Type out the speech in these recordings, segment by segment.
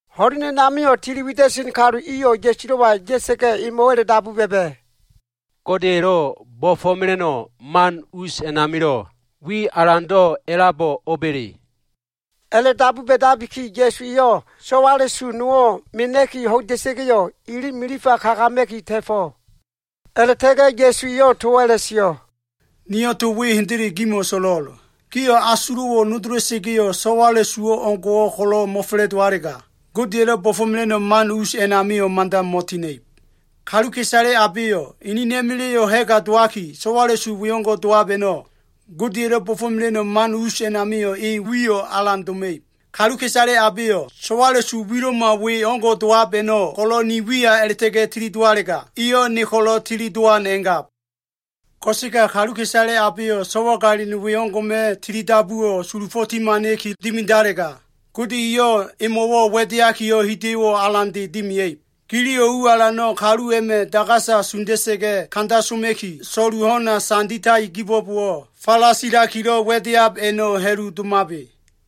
Ho꞉len a꞉namio꞉ tili wida꞉sen kalu iyo꞉ Ya꞉sulo꞉wa ya꞉sa꞉ga꞉ emo꞉wo꞉ a꞉la꞉dabu ba꞉ba꞉, “Godeya꞉lo꞉ bo꞉fo꞉mela꞉no꞉ man us a꞉namilo꞉, wi alando꞉ a꞉labo꞉ o꞉ba꞉le?” A꞉la꞉dabu ba꞉dabiki Ya꞉su eyo꞉ so꞉wala꞉su nowo꞉ mena꞉ki ho꞉ida꞉sa꞉ga꞉yo꞉, ili milifa kagama꞉ki ta꞉fo꞉. A꞉la꞉ta꞉ga꞉ Ya꞉su eyo꞉ towo꞉ a꞉la꞉sio꞉, “Niyo꞉ to we hendele gimo꞉ so꞉lo꞉l. Gio꞉ asulo꞉wo꞉ nodola꞉sa꞉ga꞉yo꞉, so꞉wala꞉su o꞉ngo꞉wo꞉ ko꞉lo꞉ mo꞉fa꞉la꞉dowalega, Godeya꞉lo꞉ bo꞉fo꞉mela꞉no꞉ man us a꞉namio꞉ mada mo꞉tina꞉ib. Kaluka꞉isale abeyo꞉ enena꞉ma꞉la꞉yo꞉ ha꞉ga dowaki, so꞉wala꞉su wengo꞉ dowab a꞉no꞉, Godeya꞉lo꞉ bo꞉fo꞉mela꞉no꞉ man us a꞉namio꞉ e wi alan doma꞉ib. “Kaluka꞉isale abeyo꞉, so꞉wala꞉su wilo꞉ma we o꞉ngo꞉ dowab a꞉no꞉ ko꞉lo꞉ ni wiya a꞉la꞉ta꞉ga꞉ tilidowalega, eyo꞉ ne ko꞉lo꞉ tili dowan a꞉ngab. Ko꞉sega kaluka꞉isale abeyo꞉ so꞉wagalin we o꞉ngo꞉ma꞉ tili dabuwo꞉ sulufo꞉ timana꞉kilo꞉ dimidalega, Gode eyo꞉ emo꞉wo꞉ wa꞉deakiyo꞉ hida꞉yo꞉ alande dimia꞉ib. Giliyo꞉ u alano꞉ kalu a꞉ma꞉ dagasa sunda꞉sa꞉ga꞉ kanda soma꞉ki, so꞉lu ho꞉na sanditai kibo꞉bowo꞉, falasilakilo꞉ wa꞉deab a꞉no꞉ ha꞉lu domabe.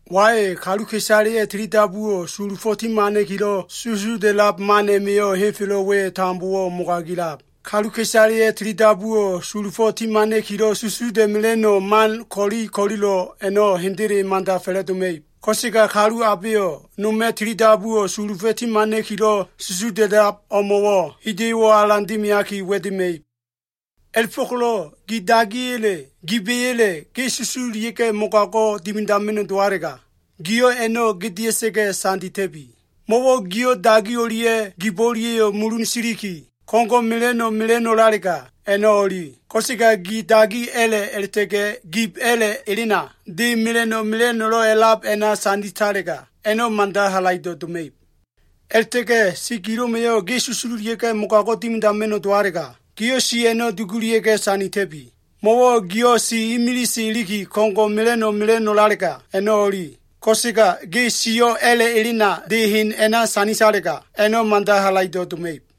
“Wai, kaluka꞉isaleya꞉ tilidabuwo꞉ sulufo꞉ ti hamana꞉kilo꞉ susuda꞉lab man a꞉ma꞉yo꞉ henfelo꞉ we tambowo꞉ mogagila꞉lab. Kaluka꞉isaleya꞉ tilidabuwo꞉ sulufo꞉ timana꞉kilo꞉ susuda꞉mela꞉no꞉ man ko꞉li ko꞉lilo꞉ a꞉no꞉ hendele mada fa꞉la꞉doma꞉ib. Ko꞉sega kalu abeyo꞉ noma꞉ tilidabuwo꞉ sulufo꞉ timana꞉kilo꞉ susuda꞉lab o꞉mo꞉wo꞉ hida꞉yo꞉wo꞉ alan dimiaki wa꞉dema꞉ib. A꞉la꞉fo꞉ko꞉lo꞉ gi dagiya꞉le, giba꞉ya꞉le ge susululia꞉ga꞉ mogago꞉ dimidama꞉no꞉ dowalega, giyo꞉ a꞉no꞉ gedea꞉sa꞉ga꞉ sandita꞉bi. Mo꞉wo꞉ giyo꞉ dagi o꞉lia꞉ gibo꞉ o꞉lia꞉yo꞉ mulun siliki, ko꞉ngo꞉ mela꞉no꞉ mela꞉no꞉lalega, a꞉no꞉ o꞉li. Ko꞉sega ge dagi a꞉la꞉ a꞉la꞉ta꞉ga꞉ gib a꞉la꞉ elena, de mela꞉no꞉ mela꞉no꞉lo꞉ a꞉lab a꞉na sanditalega, a꞉no꞉ mada halaido꞉ doma꞉ib. A꞉la꞉ta꞉ga꞉ si gilo꞉ma꞉yo꞉ ge susululia꞉ga꞉ mogago꞉ dimidama꞉no꞉ dowalega, giyo꞉ si a꞉no꞉ dugulia꞉ga꞉ sandita꞉bi. Mo꞉wo꞉ giyo꞉ si imilise iliki, ko꞉ngo꞉ mela꞉no꞉ mela꞉no꞉lalega, a꞉no꞉ o꞉li. Ko꞉sega ge siyo꞉ a꞉la꞉ elena, de hen a꞉na sanditalega, a꞉no꞉ mada halaido꞉ doma꞉ib.”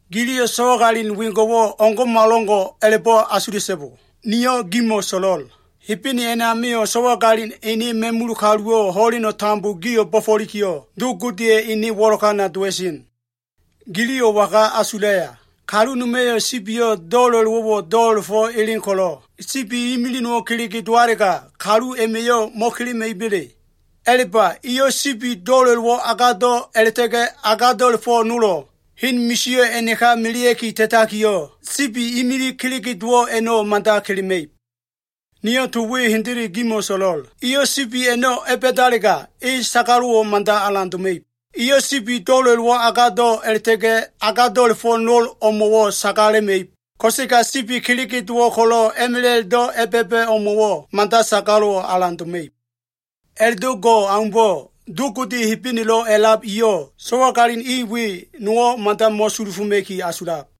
“Giliyo꞉ so꞉wagalin wengo꞉wo꞉ o꞉ngo꞉malo꞉ngo꞉ a꞉la꞉bo꞉ asula꞉so꞉bo. Niyo꞉ gimo꞉ so꞉lo꞉l. Hebene a꞉namio꞉ so꞉wagalina꞉ ene ma꞉mula꞉ kaluwo꞉ ho꞉len tambo gio꞉ bo꞉fo꞉likiyo꞉, Do Godeya꞉ ene wo꞉lokana dowa꞉sen. “Giliyo꞉ waga asulaya? Kalu noma꞉yo꞉ sibiyo꞉ do꞉la꞉lowo꞉wo꞉ do꞉la꞉fo꞉ elen ko꞉lo꞉, sibi imilig nowo꞉ kelege dowalega, kalu a꞉ma꞉yo꞉ mo꞉kelema꞉iba꞉le? A꞉la꞉ba, eyo꞉ sibi do꞉la꞉lowo꞉ agado꞉ a꞉la꞉ta꞉ga꞉ agado꞉la꞉fo꞉ nolo꞉ hen misio꞉ a꞉naka melea꞉ki ta꞉takiyo꞉, sibi imilig kelege dowo꞉ a꞉no꞉ mada kelema꞉ib. Niyo꞉ to we hendele gimo꞉ so꞉lo꞉l. Eyo꞉ sibi a꞉no꞉ a꞉ba꞉dalega, e sagalo꞉wo꞉ mada alan doma꞉ib. Eyo꞉ sibi do꞉la꞉lowo꞉ agado꞉ a꞉la꞉ta꞉ga꞉ agado꞉la꞉fo꞉ nol o꞉mo꞉wo꞉ sagalema꞉ib. Ko꞉sega sibi kelege dowo꞉ ko꞉lo꞉ a꞉ma꞉la꞉do꞉ a꞉ba꞉ba꞉ o꞉mo꞉wo꞉ mada sagalo꞉wo꞉ alan doma꞉ib. A꞉la꞉do꞉ go꞉ aumbo꞉, Do Gode Hebenelo꞉ a꞉lab eyo꞉ so꞉wagalin i we nowo꞉ mada mo꞉sulufoma꞉ki asulab.”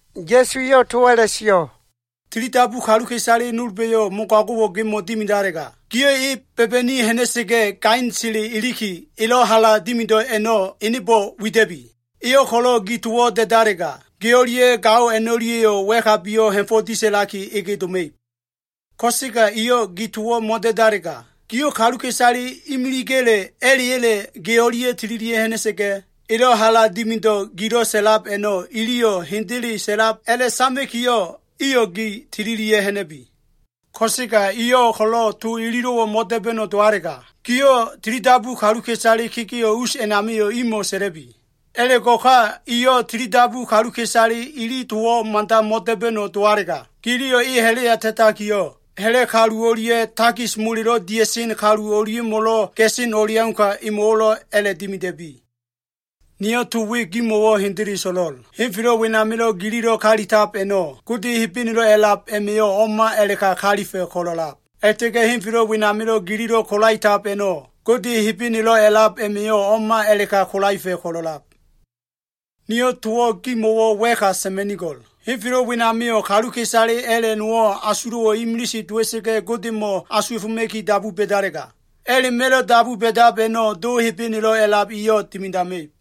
Ya꞉su eyo꞉ towo꞉ a꞉la꞉sio꞉, “Tilidabu kaluka꞉isale nolba꞉yo꞉ mogago꞉wo꞉ gemo꞉ dimidalega, giyo꞉ e ba꞉ba꞉ni ha꞉na꞉sa꞉ga꞉ gainsele iliki, elo꞉ hala dimido꞉ a꞉no꞉ enebo꞉ wida꞉bi. Eyo꞉ ko꞉lo꞉ gi towo꞉ da꞉dalega, ge o꞉lia꞉ gao a꞉no꞉lia꞉yo꞉ wa꞉kabiyo꞉ ha꞉fo꞉ disa꞉laki ege doma꞉ib. Ko꞉sega eyo꞉ gi towo꞉ mo꞉da꞉dalega, giyo꞉ kaluka꞉isale imiliga꞉le, a꞉la꞉ya꞉le ge o꞉lia꞉ tililia꞉ ha꞉na꞉sa꞉ga꞉, elo꞉ hala dimido꞉ gilo꞉ sa꞉lab a꞉no꞉, iliyo꞉ hendele sa꞉lab a꞉la꞉sama꞉kiyo꞉, iyo꞉ gi tililia꞉ ha꞉na꞉bi. Ko꞉sega eyo꞉ ko꞉lo꞉ to ililo꞉wo꞉ mo꞉da꞉ba꞉no꞉ dowalega, giyo꞉ tilidabu kaluka꞉isale kegeo꞉ us a꞉namio꞉ imo꞉ sa꞉la꞉bi. A꞉la꞉go꞉ ka, eyo꞉ tilidabu kaluka꞉isale ili towo꞉ mada mo꞉da꞉ba꞉no꞉ dowalega, giliyo꞉ e ha꞉la꞉ya ta꞉takiyo꞉, ha꞉la꞉ kalu o꞉lia꞉ takis molelo꞉ dia꞉sen kalu o꞉lia꞉mo꞉lo꞉ ga꞉sen o꞉leauka, emo꞉wo꞉lo꞉ a꞉la꞉dimida꞉bi. “Niyo꞉ to we gimo꞉wo꞉ hendele so꞉lo꞉l. Henfelo꞉ wenamilo꞉ gililo꞉ kalitab a꞉no꞉, Gode Hebenelo꞉ a꞉lab a꞉ma꞉yo꞉ o꞉ma a꞉la꞉ka kalifa꞉ ko꞉lo꞉lab. A꞉la꞉ta꞉ga꞉ henfelo꞉ wenamilo꞉ gililo꞉ kolaetab a꞉no꞉, Gode Hebenelo꞉ a꞉lab a꞉ma꞉yo꞉ o꞉ma a꞉la꞉ka kolaefa꞉ ko꞉lo꞉lab. “Niyo꞉ towo꞉ gimo꞉wo꞉ wa꞉ka sa꞉ma꞉nigo꞉l. Henfelo꞉ wenamio꞉ kaluka꞉isale a꞉la꞉ nowo꞉, asulo꞉wo꞉ imilise dowa꞉sa꞉ga꞉ Godemo꞉ asuwa꞉foma꞉ki dabu ba꞉dalega, a꞉la꞉ma꞉lo꞉ dabu ba꞉dab a꞉no꞉ Do Hebenelo꞉ a꞉lab eyo꞉ dimidama꞉ib.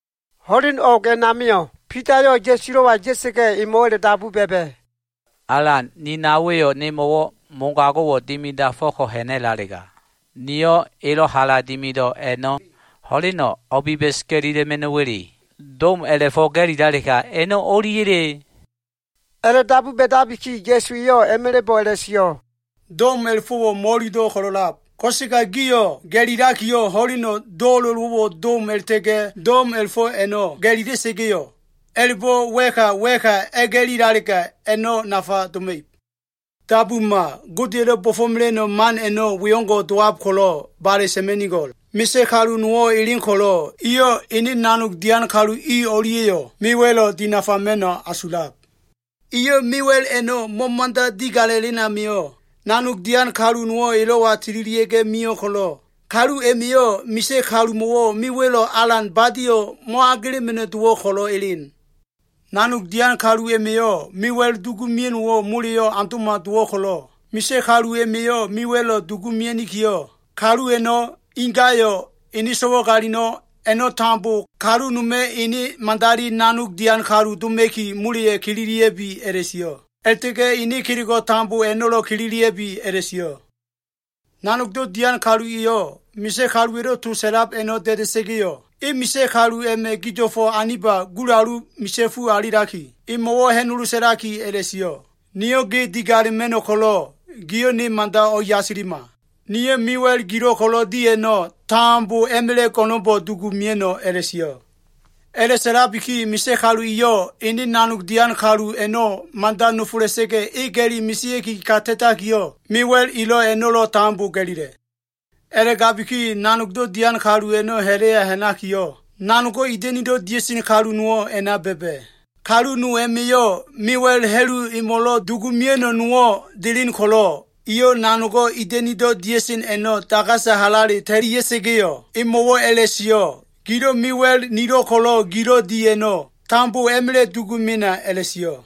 Ho꞉len o꞉g a꞉namio꞉ Bidayo꞉ Ya꞉sulo꞉wa ya꞉sa꞉ga꞉, emo꞉wo꞉ a꞉la꞉dabu ba꞉ba꞉, “Alan, ni naowa꞉yo꞉ mogago꞉wo꞉ nemo꞉ dimidafo꞉ko꞉ ha꞉na꞉lalega, niyo꞉ elo꞉ hala dimido꞉ a꞉no꞉ ho꞉leno꞉ o꞉biba꞉s ga꞉lila꞉ma꞉no꞉wa꞉le? Dom a꞉la꞉fo꞉ ga꞉lilalega, a꞉no꞉ o꞉liya꞉le?” A꞉la꞉dabu ba꞉dabiki, Ya꞉su eyo꞉ a꞉ma꞉la꞉bo꞉ a꞉la꞉sio꞉, “Dom a꞉la꞉fo꞉wo꞉ mo꞉ililo꞉ ko꞉lo꞉lab. Ko꞉sega gio꞉ ga꞉lilakiyo꞉, ho꞉leno꞉ do꞉la꞉lowo꞉wo꞉ dom a꞉la꞉ta꞉ga꞉ dom a꞉la꞉fo꞉ a꞉no꞉ ga꞉lila꞉sa꞉ga꞉yo꞉, a꞉la꞉bo꞉ wa꞉ka wa꞉ka a꞉ga꞉lilalega, a꞉no꞉ nafa doma꞉ib. “Dabuma, Godeya꞉lo꞉ bo꞉fo꞉mela꞉no꞉ man a꞉no꞉, we o꞉ngo꞉ dowab ko꞉lo꞉ bale sa꞉ma꞉nigo꞉l. Misa꞉ kalu nowo꞉ elen ko꞉lo꞉, eyo꞉ ene nanog dian kalu i o꞉lia꞉yo꞉ mewa꞉lo꞉ dinafama꞉no꞉ asulab. Eyo꞉ mewa꞉l a꞉no꞉ mo꞉mo꞉da digala꞉len amio꞉, nanog dian kalu nowo꞉ elo꞉wa tililia꞉ga꞉ mio꞉ ko꞉lo꞉, kalu a꞉ma꞉yo꞉ misa꞉ kalumo꞉wo꞉ mewa꞉lo꞉ alan badio꞉, mo꞉agelema꞉no꞉ dowo꞉ ko꞉lo꞉ delen. Nanog dian kalu a꞉ma꞉yo꞉ mewa꞉l dugu mea꞉no꞉wo꞉ moleyo꞉ aundo꞉ma dowo꞉ ko꞉lo꞉, misa꞉ kalu a꞉ma꞉yo꞉ mewa꞉lo꞉ dugu mea꞉nikiyo꞉, kalu a꞉no꞉, ingayo꞉, ene so꞉wagalin a꞉no꞉ tambo, kalu noma꞉ ene madali nanog dian kalu doma꞉ki, moleya꞉ kililia꞉bi a꞉la꞉sio꞉. A꞉la꞉ta꞉ga꞉ ene kelego꞉ tambo a꞉no꞉lo꞉ kililia꞉bi a꞉la꞉sio꞉. Nanogdo꞉ dian kalu eyo꞉, misa꞉ kaluwa꞉lo꞉ to sa꞉lab a꞉no꞉ da꞉da꞉sa꞉ga꞉yo꞉, e misa꞉ kalu a꞉ma꞉ gido꞉fo꞉ aniba gulalu misa꞉fu alilaki, emo꞉wo꞉ ha꞉nolo sa꞉laki a꞉la꞉sio꞉, ‘Niyo꞉ ge digalema꞉no꞉ ko꞉lo꞉ giyo꞉ ne mada o꞉yasilima. Niyo꞉ mewa꞉l gilo꞉ ko꞉lo꞉ di a꞉no꞉, tambo a꞉ma꞉la꞉ go꞉no꞉nbo꞉ dugu mea꞉no꞉,’ a꞉la꞉sio꞉. A꞉la꞉sa꞉labiki misa꞉ kalu eyo꞉ ene nanog dian kalu a꞉no꞉ mada nofola꞉sa꞉ga꞉, e ga꞉li mesea꞉ki ka ta꞉takiyo꞉, mewa꞉l elo꞉ a꞉no꞉lo꞉ tambo ga꞉lila꞉. A꞉la꞉gabiki nanogdo꞉ dian kalu a꞉no꞉ ha꞉la꞉ya ha꞉nakiyo꞉, nanogo꞉ ida꞉nido꞉ dia꞉sen kalu nowo꞉ a꞉na ba꞉ba꞉. Kalu no a꞉ma꞉yo꞉ mewa꞉l ha꞉lu emo꞉lo꞉ dugu mea꞉no꞉ nowo꞉ delen ko꞉lo꞉, eyo꞉ nanogo꞉ ida꞉nido꞉ dia꞉sen a꞉no꞉ dagasa halale ta꞉lia꞉sa꞉ga꞉yo꞉, emo꞉wo꞉ a꞉la꞉sio꞉, ‘Gilo꞉ mewa꞉l nilo꞉ ko꞉lo꞉ gilo꞉ di a꞉no꞉, tambo a꞉ma꞉la꞉ dugu mena,’ a꞉la꞉sio꞉.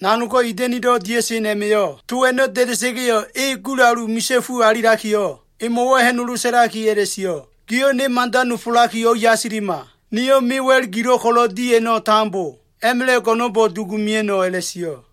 Nanogo꞉ ida꞉nido꞉ dia꞉sen a꞉ma꞉yo꞉ to a꞉no꞉ da꞉da꞉sa꞉ga꞉yo꞉, e gulalu misa꞉fu alilakiyo꞉ emo꞉wo꞉ ha꞉nolo sa꞉laki a꞉la꞉sio꞉, ‘Giyo꞉ ne mada nofolaki o꞉yasilima. Niyo꞉ mewa꞉l gilo꞉ ko꞉lo꞉ di a꞉no꞉ tambo, a꞉ma꞉la꞉ go꞉no꞉nbo꞉ dugu mea꞉no꞉,’ a꞉la꞉sio꞉.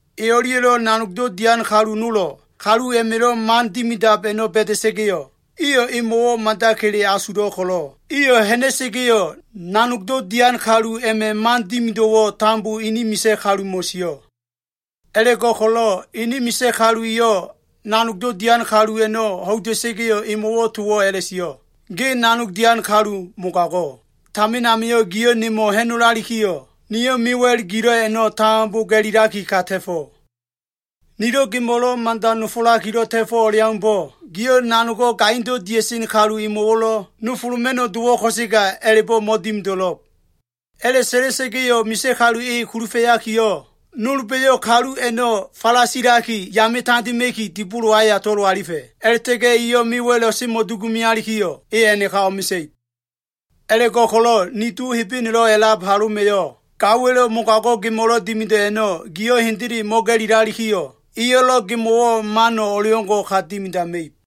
“E o꞉lia꞉lo꞉ nanogdo꞉ dian kalu nolo꞉, kalu a꞉ma꞉lo꞉ man dimidab a꞉no꞉ ba꞉da꞉sa꞉ga꞉yo꞉, iyo꞉ emo꞉wo꞉ mada kele asulo꞉ ko꞉lo꞉, iyo꞉ ha꞉na꞉sa꞉ga꞉yo꞉, nanogdo꞉ dian kalu a꞉ma꞉ man dimido꞉wo꞉ tambo ini misa꞉ kalumo꞉ sio꞉. A꞉la꞉go꞉ko꞉lo꞉ ene misa꞉ kalu eyo꞉ nanogdo꞉ dian kalu a꞉no꞉ ho꞉ida꞉sa꞉ga꞉yo꞉, emo꞉wo꞉ towo꞉ a꞉la꞉sio꞉, ‘Ge nanog dian kalu mogago꞉. Tamin amio꞉ giyo꞉ nemo꞉ ha꞉nolalikiyo꞉, niyo꞉ mewa꞉l gilo꞉ a꞉no꞉ tambo ga꞉lilaki ka ta꞉fo꞉. Nilo꞉ gemo꞉lo꞉ mada nofolakilo꞉ ta꞉fo꞉ o꞉leaumbo꞉, giyo꞉ nanogo꞉ gaindo꞉ dia꞉sen kalu emo꞉wo꞉lo꞉ nofoloma꞉no꞉ dowo꞉ ko꞉sega, a꞉la꞉bo꞉ mo꞉dimido꞉lo꞉b.’ A꞉la꞉sa꞉la꞉sa꞉ga꞉yo꞉ misa꞉ kalu e kulufa꞉yakiyo꞉, nolba꞉yo꞉ kalu a꞉no꞉ falasilaki yame tandema꞉ki, dibolo aya tolo꞉ alifa꞉. A꞉la꞉ta꞉ga꞉ eyo꞉ mewa꞉lo꞉ semo꞉dugu mealikiyo꞉, e a꞉naka o꞉mesa꞉ib. A꞉la꞉go꞉ko꞉lo꞉ ni Do Hebenelo꞉ a꞉lab haloma꞉yo꞉, gaowa꞉lo꞉ mogago꞉ gemo꞉lo꞉ dimido꞉ a꞉no꞉, giyo꞉ hendele mo꞉ga꞉lilalikiyo꞉, eyo꞉lo꞉ gemo꞉wo꞉ mano꞉ o꞉leo꞉ngo꞉ ka dimidama꞉ib.”